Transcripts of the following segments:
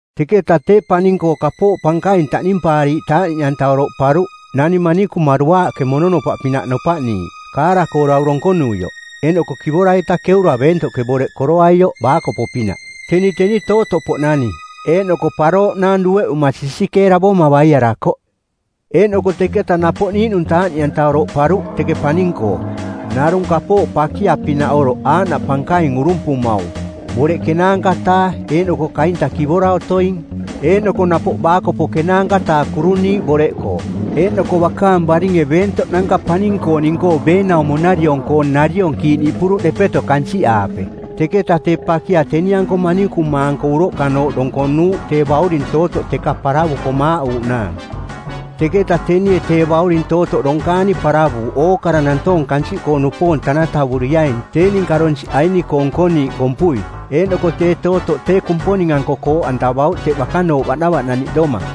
Teketa tee paning-koo kapooꞌ pankaing taꞌnimpaariiꞌ taaꞌniꞌanta oroꞌparuꞌ, nani manikuma duaaꞌke mononopaꞌpinaꞌ nopaꞌniiꞌ, kaara-koo dau donkonuioꞌ, eeꞌnoko kivora-ita keura beentoꞌke boreꞌ koroaioꞌ baakopo-pinaꞌ. Teni teni tootoꞌpoꞌnani eeꞌnoko parooꞌnang dueꞌuma sisikeeravoma baiarakoꞌ. Eeꞌnoko teketa napoꞌ niiꞌnung taaꞌniꞌanta oroꞌparuꞌ teke paning-koo, narung kapooꞌ pakia-pinaꞌoroꞌ aaꞌnaꞌ pankaing urumpumaung, boreꞌ ˜kenaanka-taa eeꞌnoko kaintang kivora otoing, eeꞌnoko napoꞌ baakopo ˜kenaanka-taa kuruniiꞌ boreꞌkoo. Eeꞌnoko bakaang baringe beentoꞌnanka paning-kooning-koo beenaumo-nariong-koo nariong kiiꞌniꞌpuruꞌ depeto kansiꞌaape. Teketa tee pakia teni-anko manikuma-anko uroꞌkanooꞌ donkonuuꞌ tee bauring tootoꞌ teka paravuko maaꞌuuꞌnaang. Teketa tenie tee bauring tootoꞌ donkaani paravuuꞌ ookara nantoong kansiꞌkoo-nupoong tanatavuriaing tee ninka donsiꞌ aini-koo nkoniiꞌ kompui, eeꞌnoko tee tootoꞌ tee Kumponing-anko kooꞌantavauꞌ teꞌ bakanooꞌ baꞌnavaꞌnaniꞌdoma.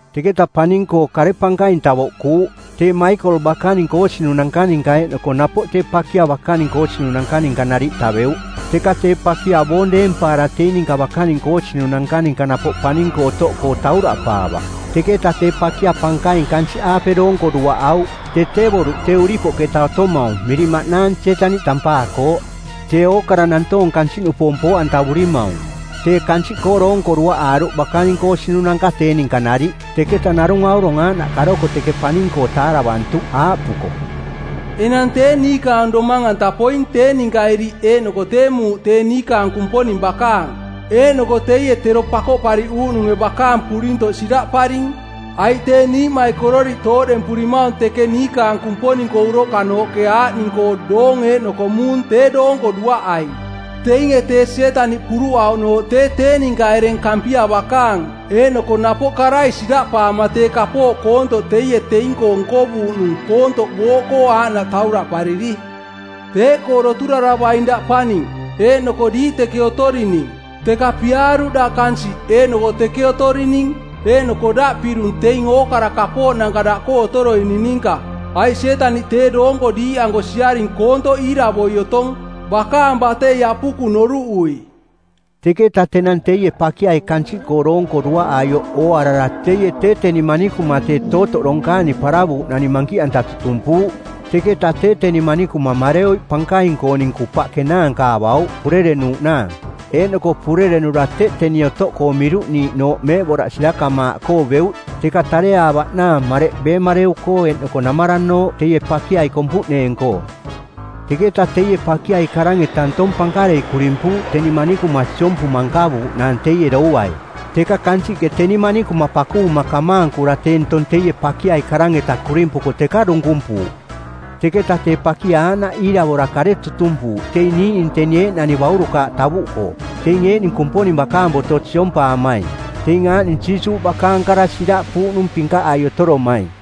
Teketa paning-koo kare pankaing tavoꞌkuuꞌ. Tee Maikol bakaning koosinunanka ninka eeꞌnoko napoꞌ tee pakia bakaning koosinunanka ninka nariꞌ taveuꞌ. Teka tee pakia boong deempaara teing-ninka bakaning koosinunanka-ninka napoꞌ paning-koo otoꞌkoo tauraꞌpaavaꞌ. Teketa tee pakia pankaing kansiꞌaape doonko duaꞌauꞌ, tee tee boruꞌ tee uripoꞌketa otomaung miring maꞌnaang Sietaniꞌ tampaakooꞌ, tee ookara nantoong kansiꞌnupoong poo-antavurimaung. Tee kansiꞌkoo doonko duaꞌaaruꞌ bakaning koosinunanka tee ninka nariꞌ. Teketa narung aurong aaꞌnaꞌ karoko teke paning-koo taaravantuꞌ aaꞌpuko, “Enang tee niikaang domang-anta poing tee ninka iriꞌ eeꞌnoko tee muuꞌ tee niikaang Kumponing bakaang, eeꞌnoko teie tero Pakoꞌpariꞌuuꞌnunge˜ bakaang purintoꞌ siraꞌparing. Aiꞌ tee niiꞌmaikororiꞌ tooꞌdempurimaung teke niikaang Kumponing-koo uroꞌkanooꞌke aaꞌning-koo doong eeꞌnoko muung tee doonko duaꞌaing. Teinge tee Sietaniꞌ puruꞌauꞌnooꞌ tee tee ninka ereng Kampia bakaang eeꞌnoko napoꞌ karai siraꞌpaama tee kapooꞌ koontoꞌ teie teing-koo nkovuuꞌnung koontoꞌ booꞌkoo aaꞌnaꞌ tauraꞌpariri. Teeꞌkoo doturaravaing daꞌ paning, eeꞌnoko diiꞌ teke otorining. Teka piaaruꞌ daꞌ kansiꞌ eeꞌnoko teke otorining eeꞌnoko daꞌ pirung teing ookara kapooꞌnanka daꞌkoo otoroining ninka, aiꞌ Sietaniꞌ tee doonko diiꞌanko siaring koontoꞌ iiravoi otong, bakaang batei apukung noruꞌui.” Teketa tenang teie pakiai kansiꞌkoo doonko duaꞌaioꞌ ooarara teie tee teni manikuma tee tootoꞌ donkaani paravuuꞌnani mankiꞌanta tutumpuuꞌ. Teketa tee teni manikuma mareoiꞌ pankaing-kooning kupaꞌ kenaanka avauꞌ purerenuuꞌnaang. Eeꞌnoko purerenura teꞌ teni otoꞌkoo miruꞌniiꞌnooꞌ meeꞌboraꞌ sirakamaaꞌkoo beuꞌ teka tareaavaꞌnaang mareꞌ beemareu-koo eeꞌnoko namaranooꞌ teie pakiai kompuꞌneeng-koo. Teketa teie pakiai karang-eta ntong pankarei kurimpuuꞌ teni manikuma siompuma nkavuuꞌnaang teie douai. Teka kansiꞌke teni manikuma pakuvuma kamaankura tee ntong teie pakiai karang-eta kurimpuko teka dunkumpuuꞌ. Teketa tee pakia aaꞌnaꞌ iiravora kare tutumpuuꞌ teing niiꞌning teni eeꞌnani baurukaaꞌ tavuꞌkoo, teing eeꞌning Kumponing bakaang boto siompaamaing, teing aaꞌning Jiisuuꞌ bakaang kara siraꞌpuuꞌnung pinkaꞌai otoromaing.